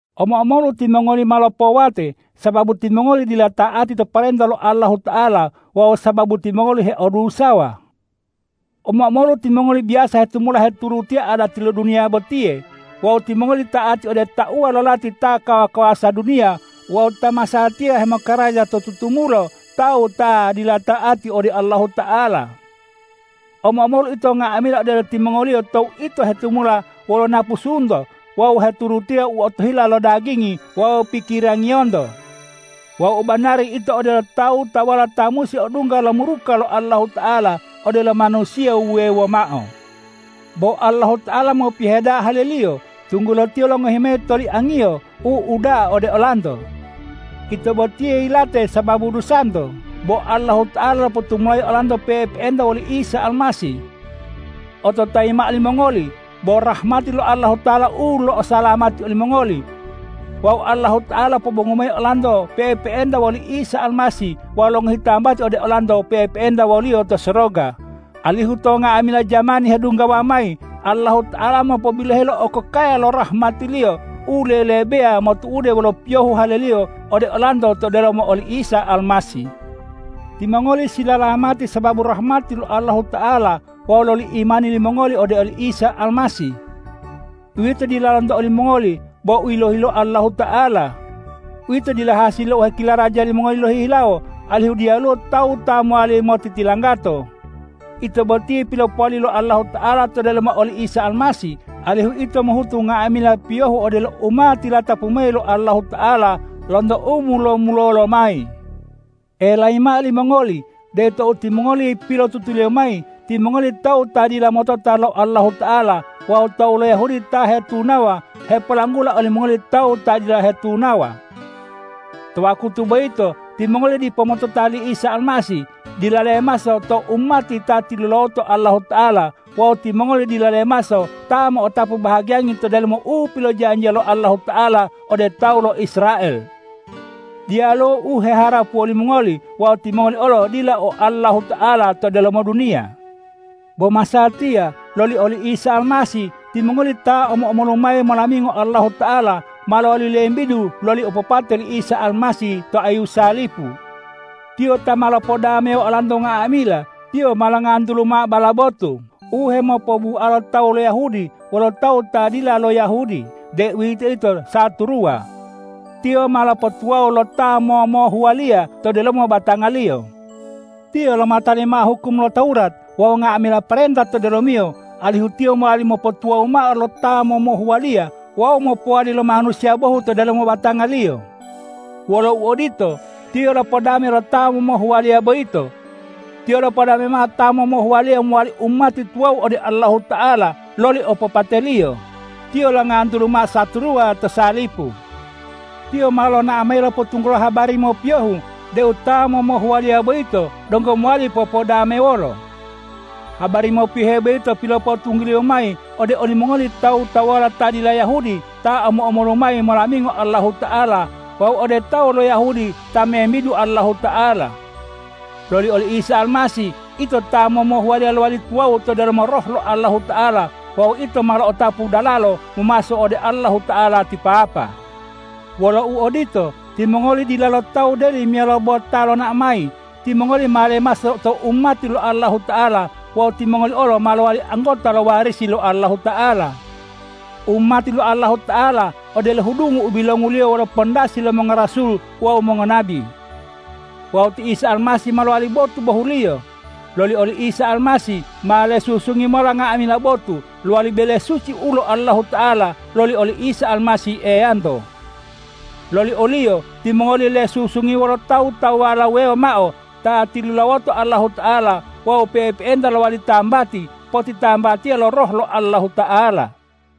Omo-omolu timongoli ma lopowate, sababu timongoli dila ta'ati to parenta lo Allahuta'ala wawu sababu timongoli heodusawa. Omo-omolu timongoli biyasa hetumula heturutiya adati lo duniya botiye wawu timongoli ta'ati ode tauwa lo lati ta kawa-kawasa duniya wawu ta masatiya hemokaraja to tutumulo tawu ta dila ta'ati ode Allahuta'ala. Omo-omolu ito nga'amila odelo timongoliyo tou ito hetumula wolo napusunto wawu heturutiya u otohila lo dagingi wawu pikirangiyonto. Wawu u banari ito odelo tawu-tawuwala ta musi odungga lo muruka lo Allahuta'ala odelo manusiya wuwewo mao. Bo Allahuta'ala mopiyohe da'a hale-Liyo, tunggulo Tiyo longohi mayi toliang-Iyo u uda'a ode olanto. Ito botiye yilate sababu dusanto, bo Allahuta'ala lopotumulayi olanto pe'epe'enta woli Isa Almasih. Ototayi mao limongoli, bo rahmati lo Allahuta'ala u lo'osalamati olimongoli. Wawu Allahuta'ala lopobongu mayi olanto pe'epe'enta woli Isa Almasih wawu longohi tambati ode olanto pe'epe'enta wo-Liyo to soroga, alihu to nga'amila jamani hedunggawa mayi Allahuta'ala mopobiloheyi lo okokaya lo rahmati-Liyo u lelebeya motu'ude wolo piyohu hale-Liyo ode olanto to delomo oli Isa Almasih. Timongoli silalamati sababu rahmati lo Allahuta'ala wawu loli imani limongoli ode oli Isa Almasih. Uwito dila lonto olimongoli bo u yilohi lo Allahuta'ala. Uwito dila hasili lo u hekilaraja limongoli lohihilawo, alihu diyaluwo tawu ta mowali motitilanggato. Ito botiye pilopowali lo Allahuta'ala to delomo oli Isa Almasih, alihu ito mohutu nga'amila piyohu odelo u ma tilatapu mayi lo Allahuta'ala lonto u mulo-mulolo lomayi. Elayi mao limongoli deu tou timongoli pilotutuliyo mayi, timongoli tawu ta dila motota lo Allahuta'ala wawu tawu lo Yahudi ta hetunawa hepolanggula olimongoli tawu ta dila hetunawa. To wakutu boyito timongoli dipo motota li Isa Almasih, dila lemaso to umati ta tilulawoto Allahuta'ala wawu timongoli dila lemaso ta mo'otapu bahagiyangi to delomo u pilojanjiya lo Allahuta'ala ode tawu lo Israel. Diyaluwo u heharapuwo limongoli wawu timongoli olo dila o Allahuta'ala to delomo duniya. Bo masatiya loli oli Isa Almasih, timongoli ta omo-omolu mayi molamingo Allahuta'ala, ma lowali lembidu loli opopate li Isa Almasih to ayu salipu. Tiyo ta ma lopodamewo olanto nga'amila. Tiyo ma longantulu mao bala botu u hemopobualo tawu lo Yahudi wolo tawu ta dila lo Yahudi, deuwitoyito saturuwa. Tiyo ma lopotuwawu lo ta momohuwaliya to delomo batanga-Liyo. Tiyo lomatali mao hukum lo Tawurat wawu nga'amila parenta to delomiyo, alihu Tiyo mowali mopotuwawu mao lo ta momohuwaliya wawu mopowali lo manusiya bohu to delomo batanga-Liyo. Wolo uodito, Tiyo lopodame lo ta momohuwaliya boyito. Tiyo lopodame mao ta momohuwaliya mowali umati tuwawu ode Allahuta'ala loli opopate-Liyo. Tiyo longantulu mao saturuwa to salipu. Tiyo ma lonao mayi lopotunggulo habari mopiyohu deu ta momohuwaliya boyito donggo mowali popodamewolo. Habari mopiyohe boyito pilopotungguliyo mayi ode olimongoli tawu-tawuwala ta dila Yahudi ta omo-omolu mayi molamingo Allahuta'ala wawu ode tawu lo Yahudi ta membidu Allahuta'ala. Loli oli Isa Almasih ito ta momohuwaliya lowali tuwawu to delomo Roh lo Allahuta'ala wawu ito ma lo'otapu dalalo momaso ode Allahuta'ala ti Papa. Wolo uodito, timongoli dilalo tawu deli meyalo bo ta lonao mayi. Timongoli ma lemaso to umati lo Allahuta'ala wawu timongoli olo ma lowali anggota lo warisi lo Allahuta'ala. Umati lo Allahuta'ala odelo hudungu u bilonguliyo wolo pandasi lo mongorasul wawu mongonabi. Wawu ti Isa Almasih ma lowali botu bohuliyo. Loli oli Isa Almasih ma lesusungi mola nga'amila botu, lowali bele suci ulo Allahuta'ala loli oli Isa Almasih Eyanto. Loli o-Liyo timongoli olo lesusungi wolo tawu-tawuwala wuwewo mao ta tilulawoto Allahuta'ala wawu pe'epe'enta lowali tambati potitambatiya lo Roh lo Allahuta'ala.